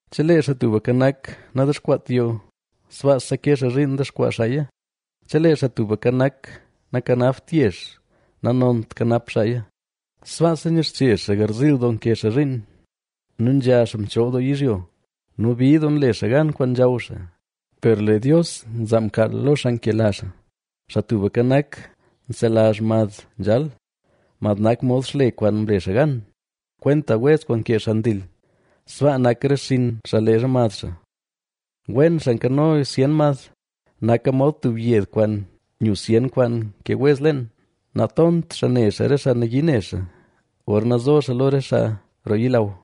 Chelee Xaa Tubka Nak nadexkwaat yoo, sbaasa ke xaa zhiin dexkwaa xaaya. Chelee Xaa Tubka Nak nakanapt yezh, nanont kanap xaaya. Sbaasa nyixche xaa garziil doo nke xaa zhiin nu nzha xaa mchool doo yizhyo nu bid doo nle xaa gan kwaan nzhaw xaa, per lee Dios nzaa mkaal lo xaa nkela xaa. Xaa Tubka Nak, nzelazh mad nzhal; mad nak mod xle kwaan mle xaa gan. Kwenta wez kwaan nkee xaa ndil, sbaa nak re xinn xaa leezha mad xaa. Wen xaa nkano zyen mad, naka mod tub yed kwaan nyu zyen kwaan nkee wez leen. Natont xaa ne xaa re xaa nayii ne xaa, gorna zo xaa lo re xaa roo yilaw.